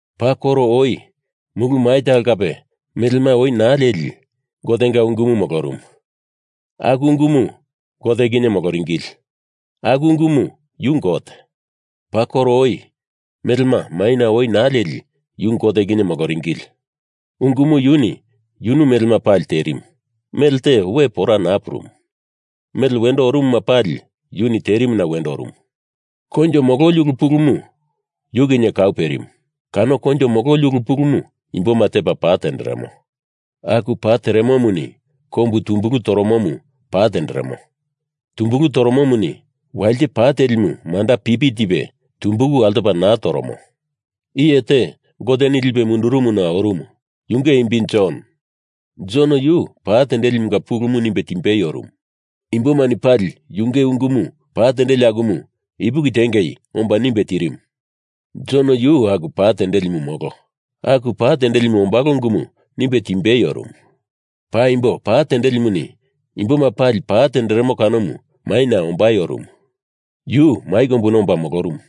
Paa koro oi mulu mai talo kape melema oi naa leli, Gotenga Ungumu molorumu. Aku Ungumu Gote kinye moloringili. Aku Ungumu yu Gote. Paa koro oi, melema maina oi naa leli, yu Gote kinye moloringili. Ungumu yuni yunu melema pali terimu. Melte we pora naa purumu. Mele wendo orumuma pali yuni terimuna wendo orumu. Koinjo mololi ulu pulumu yu kinye kau perimu. Kano koinjo mololi ulu pulumu imboma tepa pa tenderemo. Aku pa teremomuni kombu tumbulu toromomu pa tenderemo. Tumbulu toromomuni walite pa telimu manda pipi tipe tumbulu altopa naa toromo. Iye te Goteni lipe mundurumuna orumu, yunge imbi Jon. Jon yuni pa tendelimunga pulumu nimbe timbei orumu. Imbomani pali yunge ungumu pa tendeli akumu ipuki tiengei omba nimbe tirimu. Jon yu aku pa tendelimu molo. Aku pa tendelimu ombalo ungumu nimbe timbei orumu. Paimbo pa tendelimuni imboma pali pa tenderemo kanomu maina ombai orumu. Yu mai kombuna omba molorumu.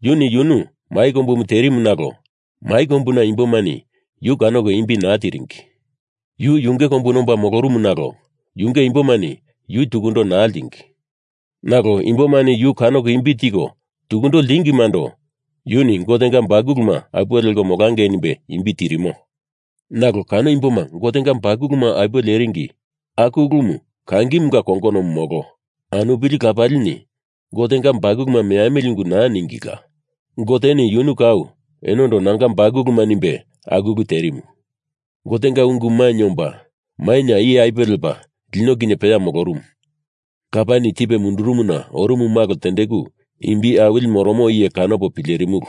Yuni yunu mai kombumu terimu nalo mai kombuna imbomani yu kanoko imbi naa tiringi. Yu yunge kombuna omba molorumu nalo yunge imbomani yu tukundo naa ltingi. Nalo imbomani yu kanoko imbi tiko tukundo ltingimando yuni Gotenga bakuluma apuwe leko molangei nimbe imbi tirimo. Nalo kano imboma Gotenga bakuluma apuwe leringi, aku ulumu kangimunga kongonomu molo, anupili lapalini Gotenga bakuluma meamili ungu naa ningila. Goteni yunu kau enondo Nanga bakuluma nimbe aku ulu terimu. Gotenga Ungu mainye omba maina iye apuwe lepa lino kinye peya molorumu. Lapani tipe mundurumuna orumu malo tendeku imbi awili moromo iye kanopo pilerimulu.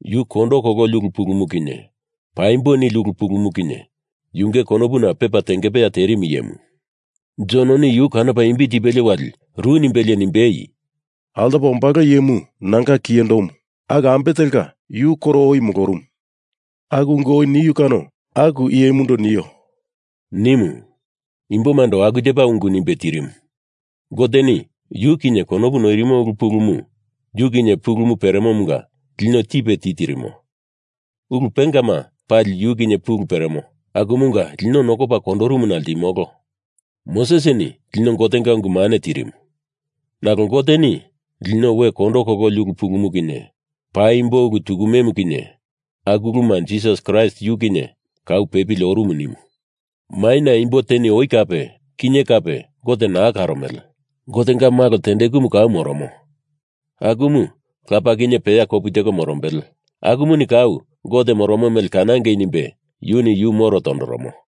Yu kondo kololi ulu pulumu kinye paimbo nili ulu pulumu kinye yunge konopuna pepa tengepeya terimu iyemu. Jononi yu kanopa imbi tipelie wali ru nimbelie nimbei, “Altopa ombalo iyemu nanga kiyendomu, aku ambe telka yu koro oi molorumu. Aku ungu oi niu kano aku iyemundo nio,” nimu. Imbomando aku tepa ungu nimbe tirimu. Goteni yu kinye konopu noirimo ulu pulumu yu kinye pulu peremomunga lino tipe titirimo. Ulu pengama pali yu kinye pulu peremo akumunga lino nokopa kondorumuna ltimolo. Mosesini lino Gotenga ungu mane tirimu. Nalo Goteni lino we kondo kololi ulu pulumu kinye paimbo ulu tukumemu kinye aku uluma Jisas Kraist yu kinye kau pepili orumu nimu. Maina imbo teni oi kape, kinye kape Gote naa karomele. Gotenga Malo tendekumu kau moromo, akumu Lapa kinye peya kopu teko morombele, akumuni kau Gote moromo mele kanangei nimbe yuni yu moro tondoromo.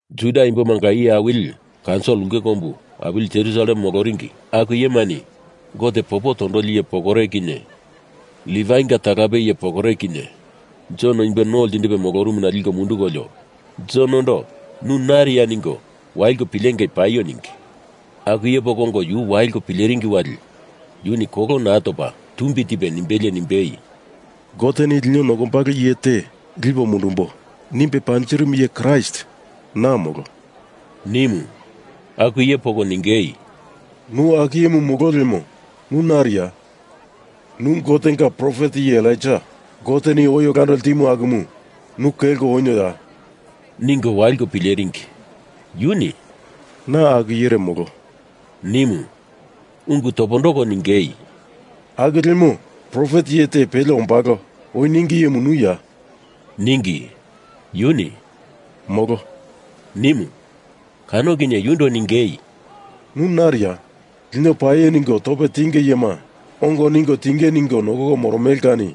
Juda imbomanga iye awili kaunsil ulke kombu awili Jerusalem moloringi aku iyemani Gote popo tondoli iye pokore kinye Livainga talape iye pokore kinye Jon imbo no ltindipe molorumuna liko mundukolio, Jonondo nu nariya ningo waliko pilengei paio ningi. Aku iye poko ongo yu waliko pileringi wali yuni kolo naa topa tumbi tipe nimbelie nimbei, “Goteni lino nokombalo iye te lipo mundumbo nimbe panjirimu iye Kraist na molo,” nimu. Aku iye poko ningei, “Nu aku iyemu molo lemo, nu nariya? Nu Gotenga profet iye Elaija Goteni oi olando ltimu akumu nu kelko onioya?” ningo waliko pileringi. Yuni “Na aku iyere molo,” nimu. Ungu topondoko ningei, “Aku lemo profet iye te pele ombalo oi ningi iyemu nuya?” ningi. Yuni “Molo!” nimu. Kano kinye yundo ningei, “Nu nariya? Lino paio ningo tope tinge iyema ongo ningo tinge ningo nokoko moromele kani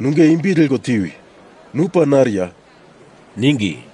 nunge imbi leko tiwi! Nu pa nariya?” ningi.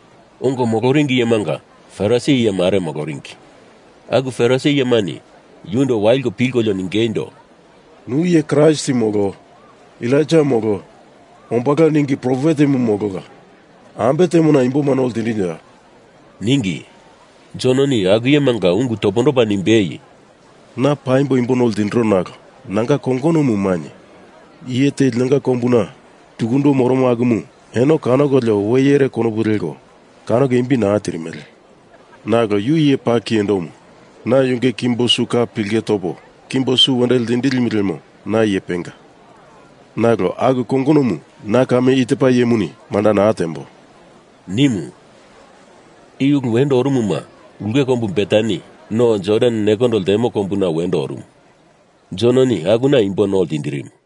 Ongo moloringi iyemanga Farisi iye mare moloringi. Aku Farisi iyemani yundo waliko pilkolio ningeindo, “Nu iye Kraist molo, Elaija molo, ombalo ningi profetemu molola. Ambe temona imboma no ltindinoya?” ningi. Jononi aku iyemanga ungu topondopa nimbei, “Na paimbo imbo no ltindiro nalo nanga kongonomu mainye. Iye te linonga kombuna tukundo moromo akumu eno kanokolio we iyere konopu leko, kanoko imbi naa tirimele. Nalo yu iye paa kiyendomu. Na yunge kimbo su ka pilke topo kimbo su wendo ltindilimu lemo na iye penga. Nalo aku kongonomu na kame i tepa iyemuni manda naa tembo,” nimu. I ulu wendo orumuma ulke kombu Betani, no Jordan nekondo ltemo kombuna, wendo orumu. Jononi akuna imbo no ltindirimu.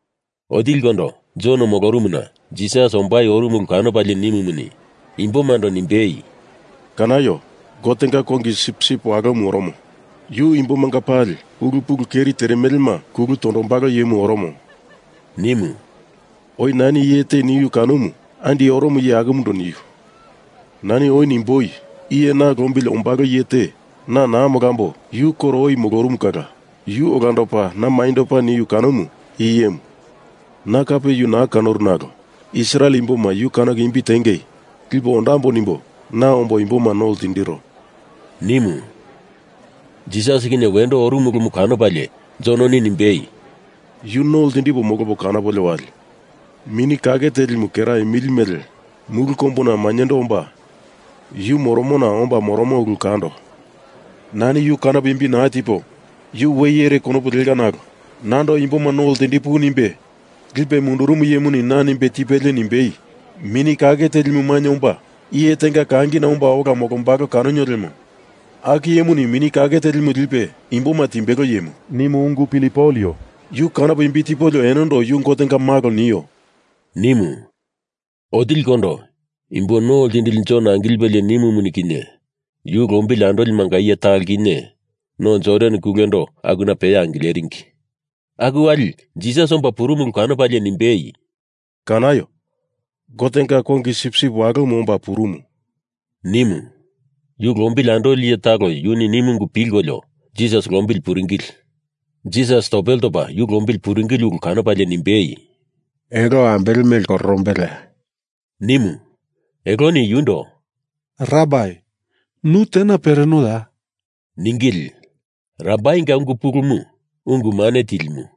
Otilikondo Jon molorumuna Jisas ombai orumu ulu kanopalie nimumuni, imbomando nimbei, “Kanaio! Gotenga Kongi sipsip Walomu oromo. Yu imbomanga pali ulu pulu keri teremelema kulu tondombalo iyemu oromo,” nimu. “Oi nani iye te niu kanomu andi oromo iye akumundo niu. Nani oi nimboi, iye na lombili ombalo iye te na naa molambo yu koro oi molorumu kala yu olandopa na mainyendopa niu kanomu i iyemu. Na kape yu naa kanoru nalo Israel imboma yu kanoko imbi tiengei lipo ondambo nimbo na ombo imboma no ltindiro,” nimu. Jisas kinye wendo orumu ulumu kanopalie Jononi nimbei, “Yu no ltindipo molopo kanopolio wali Mini Kake Telimu kera imili mele mulu kombuna mainyendo omba yu moromona omba moromo ulu kando. Nani yu kanopo imbi naa tipo yu we iyere konopu leka nalo nando imboma no ltindipuwi nimbe lipe mundurumu iyemuni na nimbe tipelie nimbei, ‘Mini Kake Telimu mainye omba iye tenga kangina omba ola molombalo kanonio lemo aku iyemuni Mini Kake Telimu lipe imboma timbelo iyemu,’ nimu ungu pilipolio yu kanopo imbi tipolio enondo Yu Gotenga Malo, nio,” nimu. Otilikondo Imbo No Ltindili Jon angilipelie nimumuni kinye, yu lombili andolimanga iye talo kinye No Jordan kulendo akuna peya angileringi. Aku wali Jisas omba purumu ulu kanopalie nimbei, “Kanaio! Gotenga Kongi Sipsip Walomu omba purumu,” nimu. Yu lombili andoli iye talo yuni nimu ungu pilkolio Jisas lombili puringili. Jisas topele topa yu lombili puringili ulu kanopalie nimbei, “Elo ambele mele kororombeleya?” nimu. Eloni yundo “Rabai, nu tena perenoya?” ningili. (Rabainga ungu pulumu ‘Ungu mane Tilimu’.)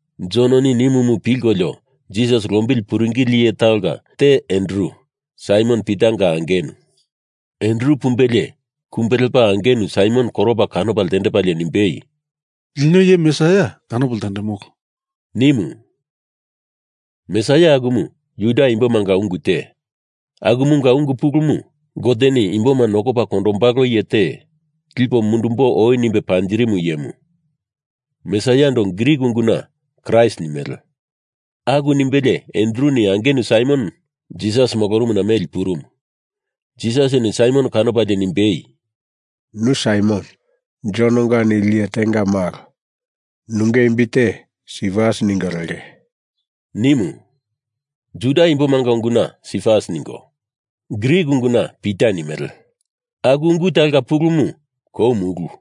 Jononi nimumu pilkolio Jisas lombili puringili iye talonga te Andru, Saimon Pitanga angenu. Andru pumbelie kumbe lepa angenu Saimon koropa kanopa ltendepalie nimbei, “Lino Iye Mesaia kanopo ltendemolo,” nimu. (Mesaia akumu Juda imbomanga ungu te, akumunga ungu pulumu Goteni imboma nokopa kondombalo iye te lipo mundumbo oi nimbe panjirimu iyemu. Mesaiando Grik unguna Kraist nimele.) Aku nimbelie Andruni angenu Saimon Jisas molorumuna meli purumu. Jisasini Saimon kanopalie nimbei, “Nu Saimon, Jononga nili iye tenga malo. Nunge imbi te Sifas ningo lenge,” nimu. (Juda imbomanga unguna Sifas ningo, Grik unguna Pita nimele, aku ungu talonga pulumu kou mulu.)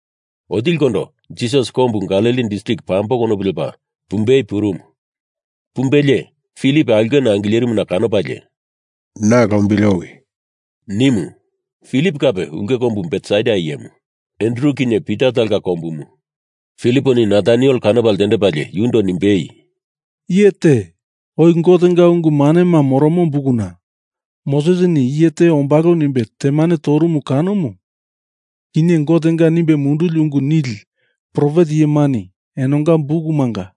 Otilikondo Jisas Kombu Galili distrik pambo konopu lepa pumbei purumu. Pumbelie Filip aulkena angilerimuna kanopalie, “Na lombili owi,” nimu. Filip kape ulke kombu Betsaida iyemu, Andru kinye Pita talonga kombumu. Filiponi Nataniel kanopa ltendepalie yundo nimbei, “Iye te, oi Gotenga ungu manema moromo bukuna Mosesini iye te ombalo nimbe temane torumu kanomu kinye, Gotenga nimbe munduli ungu nili profet iyemani enonga bukumanga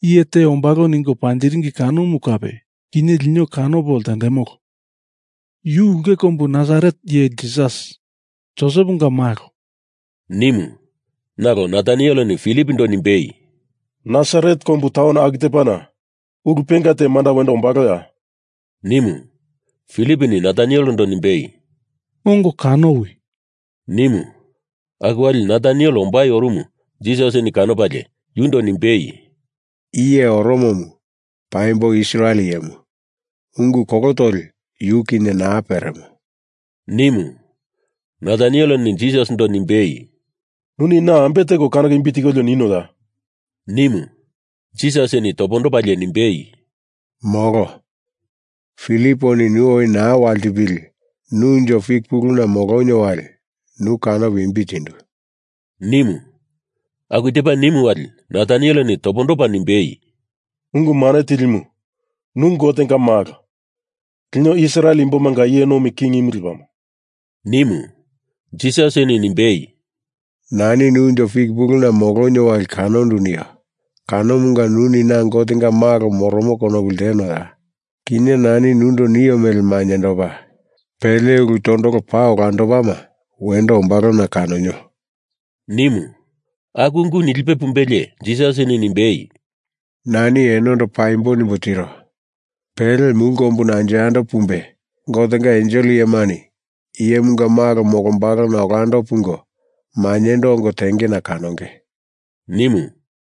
iye te ombalo ningo panjiringi kanomu kape, kinye lino kanopo ltendemolo. Yu ulke kombu Nasaret iye Jisas, Joseponga malo,” nimu. Nalo Natanieleni Filipondo nimbei, “Nasaret kombu taun aku tepana ulu penga te manda wendo ombaloya?” nimu. Filiponi Natanielendo nimbei, “Ongo kanowi!” nimu. Aku wali Nataniel ombai orumu Jisasini kanopalie, yundo nimbei, “I iye oromomu paimbo Israel iyemu, ungu kolo toli yu kinye naa peremo,” nimu. Natanieleni Jisasindo nimbei, “Nuni na ambe teko kanoko imbi tikolio ninoya?” nimu. Jisasini topondopalie nimbei, “Molo. Filiponi nu oi naa waltipili nu unjo fik puluna molonio wali nu kanopo imbi tindu,” nimu. Aku tepa nimu wali Natanieleni topondopa nimbei, “Ungu Mane Tilimu, nu Gotenga Malo, lino Israel imbomanga iye nomi kingimu lepamo,” nimu. Jisasini nimbei, “Nani nu unjo fik puluna molonio wali kanondu nio kanomunga nuni na Gotenga Malo moromo konopu ltenoya? Kinye nani nundo nio mele mainyendopa pele ulu tondolo paa olandopama wendo ombalona kanonio,” nimu. Aku ungu nilipe pumbelie Jisasini nimbei, “Nani enondo paimbo nimbo tiro. Pele mulu kombuna anjo yando pumbe, Gotenga ensel iyemani Iyemunga Malo molombalona olando pungo mainyendo ongo tengena kanonge,” nimu.